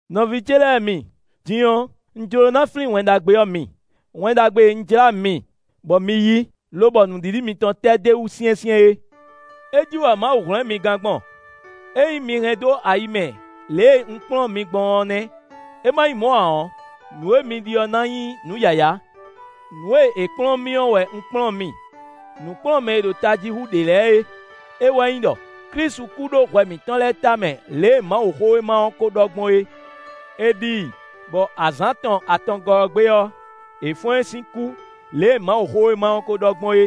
Nɔví ce lɛ́ɛ mi, din ɔ́, un jló ná flín Wɛn Ɖagbe ɔ́ mi; Wɛn Ɖagbe e un jlá mi, bɔ mi yí, lobɔ nǔɖiɖi mitɔn tɛ́ d'é wú syɛ́nsyɛ́n é. É jí wɛ Mawu hwlɛ́n mi gán gbɔn; ényí mi hɛn dó ayi mɛ lě e un kplɔ́n mi gbɔn ɔ́ nɛ́; é ma nyí mɔ̌ ǎ ɔ́, nǔ e mi ɖi ɔ́ ná nyí nǔ yǎyá. Nǔ e è kplɔ́n mì ɔ́ wɛ un kplɔ́n mi, nǔkplɔ́nmɛ e ɖo tají hú ɖě lɛ́ɛ é; é wɛ nyí ɖɔ: Klísu kú ɖó hwɛ mǐtɔn lɛ́ɛ tamɛ lě e Mawuxówéma ɔ́ ko ɖɔ gbɔn é. È ɖi i, bɔ azǎn tɔn atɔngɔ́ ɔ́ gbe ɔ́, è fɔ́n ɛ sín kú lě e Mawuxówéma ɔ́ kó ɖɔ gbɔn é.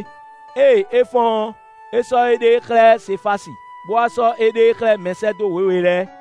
Ée é fɔ́n ɔ́, é sɔ́ éɖée xlɛ́ Sefási, bó wá sɔ́ éɖée xlɛ́ mɛsɛ́dó wěwe lɛ́ɛ.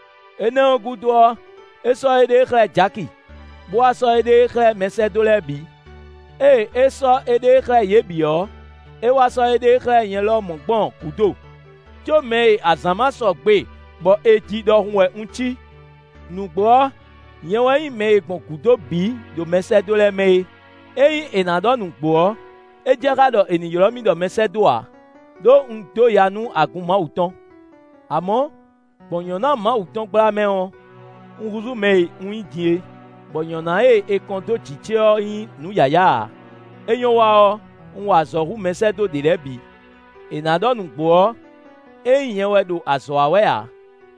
Énɛ́ ɔ́ gúdo ɔ́, é sɔ́ éɖée xlɛ́ Jaki, bó wá sɔ́ éɖée xlɛ́ mɛsɛ́dó lɛ́ɛ bǐ. Ée é sɔ́ éɖée xlɛ́ yě bǐ ɔ́, é wá sɔ́ éɖée xlɛ́ nyɛ lɔmɔ̌ gbɔn gǔdo; có mɛ e azǎn ma sɔgbe bɔ è ji ɖɔhun wɛ un cí. Nǔgbó ɔ́, nyɛ wɛ nyí mɛ e gbɔn gǔdo bǐ ɖo mɛsɛ́dó lɛ́ɛ mɛ é. Ényí è nǎ ɖɔ nǔgbó ɔ́, é jɛ xá ɖɔ è nǐ ylɔ́ mì ɖɔ mɛsɛ́dó ǎ, ɖó un dó ya nú agun Mawu tɔn. Amɔ̌, gbɔn nyɔ̌ná Mawu tɔn gbla mɛ ɔ́, un húzú mɛ e un nyí din é, bɔ nyɔ̌ná e è kɔn dó jǐ ce ɔ́ nyí nǔ yǎyá ǎ: é nyɔ́ wa ɔ́, un wa azɔ̌ hú mɛsɛ́dó ɖě lɛ́ɛ bǐ. È nǎ ɖɔ nǔgbó ɔ́, é nyí nyɛ wɛ ɖo azɔ̌ wa wɛ ǎ;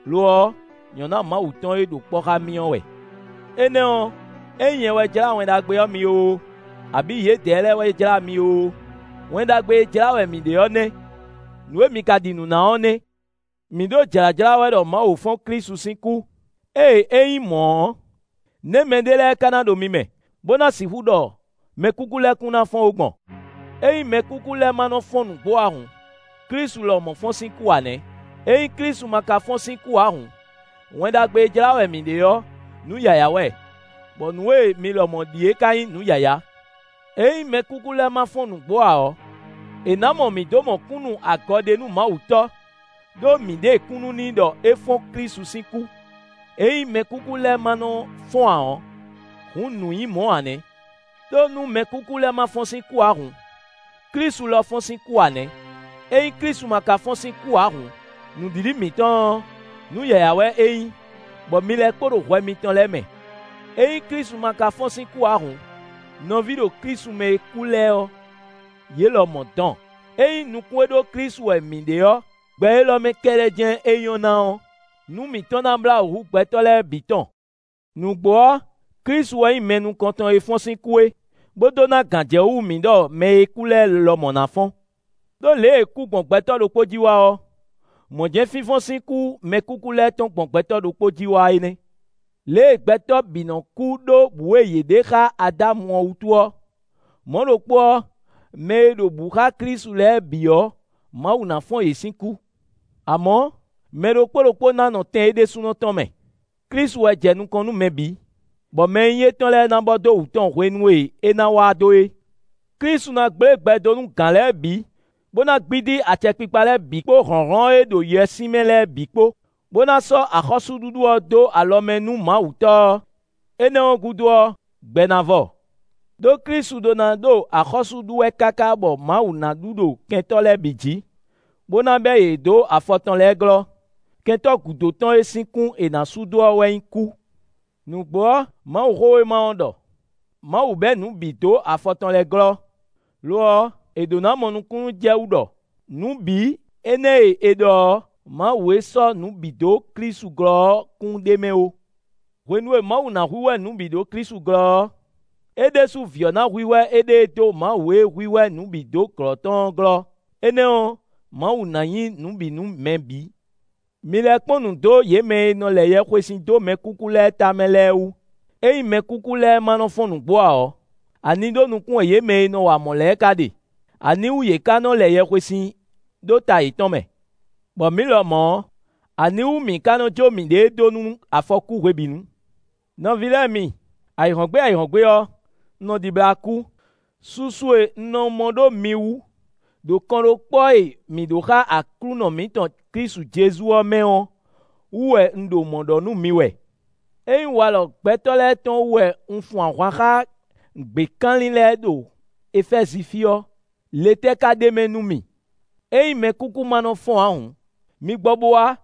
lo ɔ́, nyɔ̌ná Mawu tɔn e ɖo kpɔ́ xá mì ɔ́ wɛ. Énɛ́ ɔ́, ényí nyɛ wɛ jlá Wɛn Ɖagbe ɔ́ mi oo, abǐ yědɛɛ lɛ́ɛ wɛ jlá mi oo, Wɛn Ɖagbe e jlá wɛ mǐ ɖe ɔ́ nɛ́; nǔ e mi ka ɖi nǔ ná ɔ́ nɛ́. Mǐ ɖo jlǎjlá wɛ ɖɔ Mawu fɔ́n Klísu sín kú; ée é nyí mɔ̌ ɔ́, nɛ̌ mɛɖé lɛ́ɛ ka ná ɖo mi mɛ, bó ná sixú ɖɔ mɛkúkú lɛ́ɛ kún ná fɔ́n ó gbɔn? Ényí mɛkúkú lɛ́ɛ ma nɔ fɔ́n nǔgbó ǎ hǔn, Klísu lɔmɔ̌ fɔ́n sín kú ǎ nɛ́. Ényí Klísu ma ka fɔ́n sín kú ǎ hǔn, Wɛn Ɖagbe e jlá wɛ mǐ ɖe ɔ́, nǔ yǎyá wɛ, bɔ nǔ e mi lɔmɔ̌ ɖi é ka nyí nǔ yǎyá. Ényí mɛkúkú lɛ́ɛ má nɔ́ fɔ́n nǔgbó ǎ ɔ́, è nǎ mɔ mǐ dó mɔ kúnnu-agɔɖenúmawutɔ́; ɖó mǐ ɖe kúnnu n'i ɖɔ é fɔ́n Klísu sín kú; ényí mɛkúkú lɛ́ɛ ma nɔ́ fɔ́n ǎ ɔ́, hǔn nǔ nyí mɔ̌ ǎ nɛ́. Đó nú mɛkúkú lɛ́ɛ ma nɔ fɔ́n sín kú ǎ hǔn, Klísu lɔ fɔ́n sín kú ǎ nɛ́. Ényí Klísu ma ka fɔ́n sín kú ǎ hǔn, nǔɖiɖi mitɔn ɔ́, nǔ yǎyá wɛ é nyí, bɔ mi lɛ́ kpo ɖo hwɛ mitɔn lɛ́ɛ mɛ. Ényí Klísu ma ka fɔ́n sín kú ǎ hǔn, nɔví ɖo Klísu mɛ e kú lɛ́ɛ ɔ́, yě lɔmɔ̌ dɔn. Ényí nukún e ɖó Klísu wɛ mǐ ɖe ɔ́, gbɛ élɔ́ mɛ kɛ́ɖɛ́ jɛ́n é nyɔ́ ná ɔ́, nǔ mǐtɔn ná blá wǔ hú gbɛtɔ́ lɛ́ɛ bǐ tɔn. Nǔgbó ɔ́, Klísu wɛ nyí mɛ nukɔntɔn e fɔ́n sín kú é, bó dó ná gǎnjɛwú mǐ ɖɔ mɛ e kú lɛ́ɛ lɔmɔ̌ ná fɔ́n. Đó lě e kú gbɔn gbɛtɔ́ ɖokpó jí wá ɔ́, mɔ̌ jɛ́n fínfɔ́n sín kú mɛkúkú lɛ́ɛ tɔn gbɔn gbɛtɔ́ ɖokpó jí wá é nɛ́. Lě e gbɛtɔ́ bǐ nɔ kú ɖó bǔ e yě ɖe xá Adámu ɔ́ wútu ɔ́, mɔ̌ ɖokpó ɔ́, mɛ e ɖo bǔ xá Klísu lɛ́ɛ bǐ ɔ́, Mawu ná fɔ́n yě sín kú. Amɔ̌, mɛ ɖokpó ɖokpó ná nɔ tɛn é ɖésúnɔ tɔn mɛ; Klísu wɛ jɛ nukɔn nú mɛ bǐ, bɔ mɛ e nyí étɔn lɛ́ɛ ná bɔ dó wǔ tɔn hwenu e é ná wá dó é. Klísu ná gblé gbɛ dó nú gǎn lɛ́ɛ bǐ, bó ná gbídí acɛkpikpa lɛ́ɛ bǐ kpó hlɔ̌nhlɔ́n e ɖo yɛswímɛ lɛ́ɛ bǐ kpó, bó ná sɔ́ axɔ́súɖuɖu ɔ́ dó alɔ mɛ nú Mawu Tɔ́ ɔ́. Énɛ́ ɔ́ gúdo ɔ́, gbɛ ná vɔ. Đó Klísu ɖó ná ɖo axɔ́sú ɖu wɛ káká bɔ Mawu ná ɖu ɖo kɛntɔ́ lɛ́ɛ bǐ jǐ, bó ná bɛ́ yě dó afɔ tɔn lɛ́ɛ glɔ́. Kɛntɔ́ gúdo tɔn e sín kún è nǎ sú dó ɔ́ wɛ nyí kú. Nǔgbó ɔ́, Mawuxówéma ɔ́ ɖɔ: “Mawu bɛ̌ nǔ bǐ dó afɔ tɔn lɛ́ɛ glɔ́.” Lo ɔ́, è ɖǒ ná mɔ nukúnnú jɛ wú ɖɔ “nǔ bǐ” énɛ́ e è ɖɔ ɔ́, Mawu e sɔ́ nǔ bǐ dó Klísu glɔ́ ɔ́ kún ɖ'é mɛ ó. Hwenu e Mawu ná hwíhwɛ́ nǔ bǐ ɖó Klísu glɔ́ ɔ́, é ɖésú Vǐ ɔ́ ná hwíhwɛ́ éɖée dó Mawu e hwíhwɛ́ nǔ bǐ dó glɔ́ tɔn ɔ́ glɔ́; énɛ́ ɔ́, Mawu ná nyí nǔ bǐ nú mɛ bǐ. Mi lɛ kpɔ́n nǔ dó yě mɛ e nɔ lɛ yɛhwesin dó mɛkúkú lɛ́ɛ tamɛ lɛ́ɛ wú; ényí mɛkúkú lɛ́ɛ ma nɔ fɔ́n nǔgbó ǎ ɔ́, ani ɖó nukún wɛ yě mɛ e nɔ wa mɔ̌ lɛ́ɛ ka ɖe? Aniwú yě ká nɔ lɛ yɛhwesin ɖó ta yětɔn mɛ? Bɔ mǐ lɔmɔ̌, aniwú mǐ ka nɔ jó miɖée dó nú afɔkú hwebǐnu? Nɔví lɛ́ɛ mi, ayǐhɔ́ngbe ayǐhɔ́ngbe ɔ́, un nɔ ɖibla kú: susu e un nɔ mɔ ɖó mi wú ɖo kɔnɖókpɔ́ e mǐ ɖó xa Aklúnɔ mǐtɔn Klísu Jezu ɔ́ mɛ ɔ́ wú wɛ un ɖo mɔ̌ ɖɔ nú mi wɛ. Ényí walɔ gbɛtɔ́ lɛ́ɛ tɔn wú wɛ un fun ahwan xá gběkanlin lɛ́ɛ ɖo Efɛ́zi fí ɔ́, le tɛ́ ká ɖ'é mɛ nú mì? Ényí mɛkúkú ma nɔ fɔ́n ǎ hǔn, mi gbɔ bo wá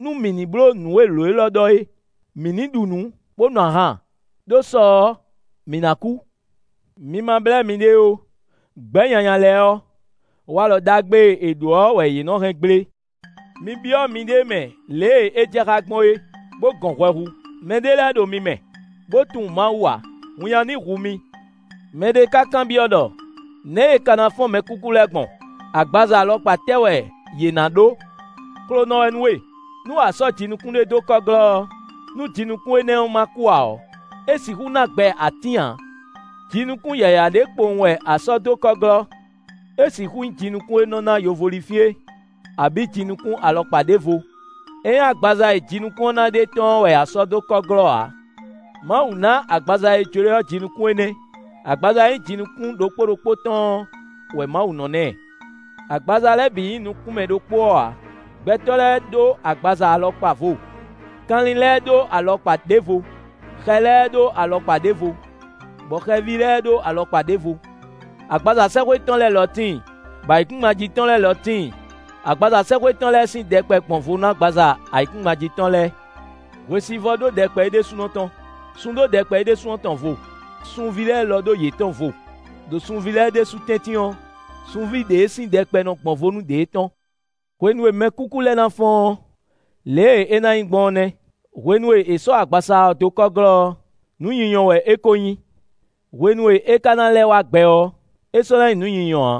nú mǐ ní bló nǔ e lǒ élɔ́ ɖɔ é: “Mǐ ní ɖu nǔ, bó nu ahan, ɖó sɔ ɔ́, mǐ ná kú.” Mi ma blɛ́ miɖée ó: “Gbɛ̌ nyanya lɛ́ɛ ɔ́, walɔ ɖagbe e è ɖǒ ɔ́ wɛ yě nɔ hɛn gblé.” Mi byɔ́ miɖée mɛ lě e é jɛ xá gbɔn é, bó gɔn hwɛ hu. Mɛ ɖé lɛ́ɛ ɖo mi mɛ, bó tunwun Mawu ǎ; winnyá ní hu mi. Mɛ ɖé ka kanbyɔ́ ɖɔ: “Nɛ̌ è ka ná fɔ́n mɛkúkú lɛ́ɛ gbɔn? Agbaza alɔkpa tɛ́ wɛ yě ná ɖó?” Xlonɔ wɛ nú we! Nú a sɔ́ jinukún ɖé dó kɔ́ glɔ́ ɔ́, nú jinukún énɛ́ ma kú ǎ ɔ́, é sixú ná gbɛ atín ǎ. Jinukún yǎyá ɖé kpowun wɛ a sɔ́ dó kɔ́ glɔ́; é sixú nyí jinukún e nɔ ná yovólinfín é, abǐ jinukún alɔkpa ɖěvo; é nyí agbaza e jinukún ɔ́ ná ɖe tɔ́n ɔ́ wɛ a sɔ́ dó kɔ́ glɔ́ ǎ. Mawu ná agbaza e jló e ɔ́ jinukún énɛ́; agbaza e nyí jinukún ɖokpó ɖokpó tɔn ɔ́ wɛ Mawu nɔ ná ɛ. Agbaza lɛ́ɛ bǐ nyí nukún mɛ ɖokpó ɔ́ ǎ; gbɛtɔ́ lɛ́ɛ ɖó agbaza alɔkpa vo; kanlin lɛ́ɛ ɖó alɔkpa ɖěvo; xɛ lɛ́ɛ ɖó alɔkpa ɖěvo, bɔ hweví lɛ́ɛ ɖó alɔkpa ɖěvo. Agbaza sɛ́xwé tɔn lɛ́ɛ lɔ tíin, bɔ ayǐkúngban jí tɔn lɛ́ɛ lɔ tíin; agbaza sɛ́xwé tɔn lɛ́ɛ sín ɖɛkpɛ gbɔn vo nú agbaza ayǐkúngban jí tɔn lɛ́ɛ. Hwesivɔ́ ɖó ɖɛkpɛ é ɖésúnɔ tɔn; sun ɖó ɖɛkpɛ é ɖésú tɔn vo; sunví lɛ́ɛ ɖó yětɔn vo; ɖo sunví lɛ́ɛ ɖésú tɛ́ntin ɔ́, sunví ɖě sín ɖɛkpɛ nɔ gbɔn vo nú ɖě tɔn. Hwenu e mɛkúkú lɛ́ɛ ná fɔ́n ɔ́, lě e é ná nyí gbɔn ɔ́ nɛ́. Hwenu e è sɔ́ agbaza ɔ́ dó kɔ́ glɔ́ ɔ́, nǔ nyinyɔ wɛ é kó nyí; hwenu e é ka ná lɛ́ wá gbɛ ɔ́, é sɔ́ ná nyí nǔ nyinyɔ ǎ.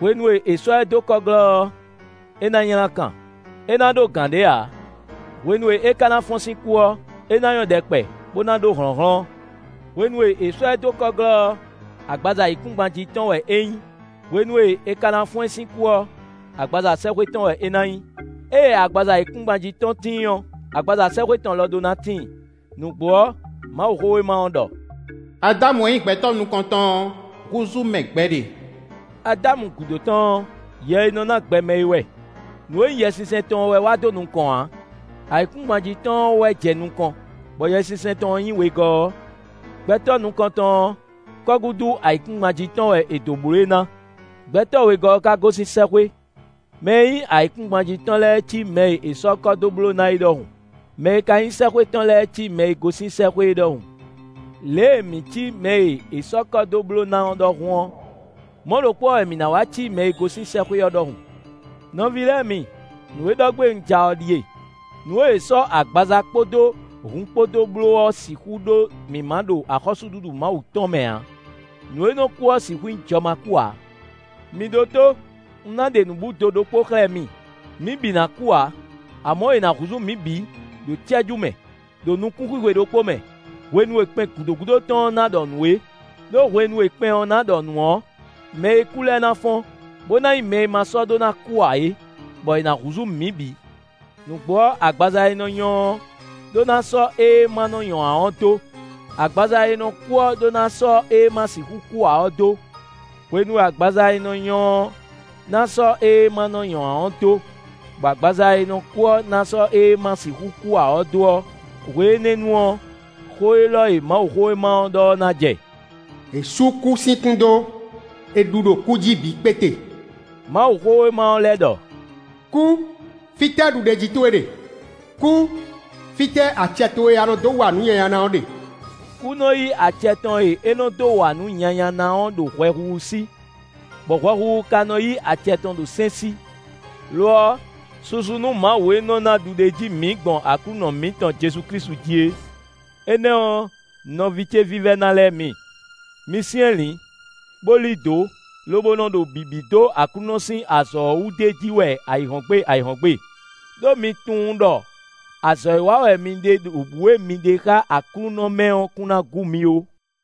Hwenu e è sɔ́ ɛ dó kɔ́ glɔ́ ɔ́, é ná nylá kan; é ná ɖó gǎn ɖé ǎ; hwenu e é ka ná fɔ́n sín kú ɔ́, é ná nyɔ́ ɖɛkpɛ, bó ná ɖó hlɔ̌nhlɔ́n. Hwenu e è sɔ́ ɛ dó kɔ́ glɔ́ ɔ́, agbaza ayǐkúngban jí tɔn wɛ é nyí; hwenu e é ka ná fɔ́n sín kú ɔ́, agbaza sɛ́xwé tɔn wɛ é ná nyí. Ée agbaza ayǐkúngban jí tɔn tíin ɔ́, agbaza sɛ́xwé tɔn lɔ ɖó ná tíin. Nǔgbó ɔ́, Mawuxówéma ɔ́ ɖɔ: “Adámu e nyí gbɛtɔ́ nukɔntɔn ɔ́, húzú mɛ gbɛɖe”; Adámu gúdo tɔn ɔ́, yɛ e nɔ ná gbɛ mɛ é wɛ. Nǔ e nyí Yɛsinsɛn tɔn ɔ́ wɛ wá dó nukɔn ǎ, ayǐkúngban jí tɔn ɔ́ wɛ jɛ nukɔn, bɔ Yɛsinsɛn tɔn ɔ́ nyí wegɔ́ ɔ́. Gbɛtɔ́ nukɔntɔn ɔ́, kɔ́gúdu ayǐkúngban jí tɔn wɛ è dǒ bló e ná; gbɛtɔ́ wegɔ́ ɔ́ ka gosín sɛ́xwé. Mɛ e nyí ayǐkúngban jí tɔn lɛ́ɛ cí mɛ e è sɔ́ kɔ́ dó bló ná é ɖɔhun; mɛ e ka nyí sɛ́xwé tɔn lɛ́ɛ cí mɛ e gosín sɛ́xwé é ɖɔhun. Lě e mǐ cí mɛ e è sɔ́ kɔ́ dó bló ná ɔ́ ɖɔhun ɔ́, mɔ̌ ɖokpó ɔ́ wɛ mǐ ná wá cí mɛ e gosín sɛ́xwé ɔ́ ɖɔhun. Nɔví lɛ́ɛ mi, nǔ e ɖɔ gbé un ja ɔ́ ɖíe: nǔ e è sɔ́ agbaza kpódó hun kpó dó bló ɔ́ sixú ɖó mǐmá ɖo axɔ́súɖuɖu Mawu tɔn mɛ ǎ; nǔ e nɔ kú ɔ́ sixú nyí jɔmakú ǎ. Mi ɖótó! Un ná ɖe nǔbúdo ɖokpó xlɛ́ mi; mǐ bǐ ná kú ǎ, amɔ̌ è nǎ húzú mǐ bǐ, ɖo cɛ́jú mɛ, ɖo nukún xwixwe ɖokpó mɛ, hwenu e kpɛn gǔdo gúdo tɔn ɔ́ ná ɖɔ nǔ é; ɖó hwenu e kpɛn ɔ́ ná ɖɔ nǔ ɔ́, mɛ e kú lɛ́ɛ ná fɔ́n, bó ná nyí mɛ e ma sɔ́ ɖó ná kú ǎ é, bɔ è nǎ húzú mǐ bǐ. Nǔgbó ɔ́, agbaza e nɔ nyɔ ɔ́ ɖó ná sɔ́ ée ma nɔ nyɔ ǎ ɔ́ dó; agbaza e nɔ kú ɔ́ ɖó ná sɔ́ ée ma sixú kú ǎ ɔ́ dó. Hwenu e agbaza e nɔ nyɔ́ ɔ́ ná sɔ́ ée ma nɔ́ nyɔ́ ǎ ɔ́ dó, bɔ agbaza e nɔ kú ɔ́ ná sɔ́ ée ma sixú kú ǎ ɔ́ dó ɔ́, hwe énɛ́ ɔ́ nu ɔ́, xó élɔ́ e Mawuxówéma ɔ́ ɖɔ ɔ́ ná jɛ: “È sú kú sín kún dó; è ɖu ɖo kú jí bǐ kpéte!” Mawuxówéma ɔ́ lɛ́ ɖɔ: “Kú, fítɛ́ ɖuɖéjí towe ɖe? Kú, fítɛ́ acɛ towe e a nɔ dó wa nǔ nyanya ná ɔ́ ɖe?” Kú nɔ yí acɛ tɔn e é nɔ dó wa nǔ nyanya ná ɔ́ ɖo hwɛhuhu sí, bɔ hwɛhuhu ka nɔ yí acɛ tɔn ɖo sɛ́n sí. Lo ɔ́, susu nú Mawu e nɔ ná ɖuɖéjí mǐ gbɔn Aklúnɔ mǐtɔn Jezu Klísu jí é! Énɛ́ ɔ́, nɔví ce vívɛ́ná lɛ́ɛ mi, mi syɛ́nlǐn, bó lí dǒ, lobo nɔ ɖo bǐbí dó Aklúnɔ sín azɔ̌ ɔ́ wú d'é jí wɛ ayǐhɔ́ngbe ayǐhɔ́ngbe; ɖó mi tunwun ɖɔ azɔ̌ e wa wɛ mi ɖe ɖo bǔ e mi ɖe xá Aklúnɔ mɛ ɔ́ kún ná gú mi ó.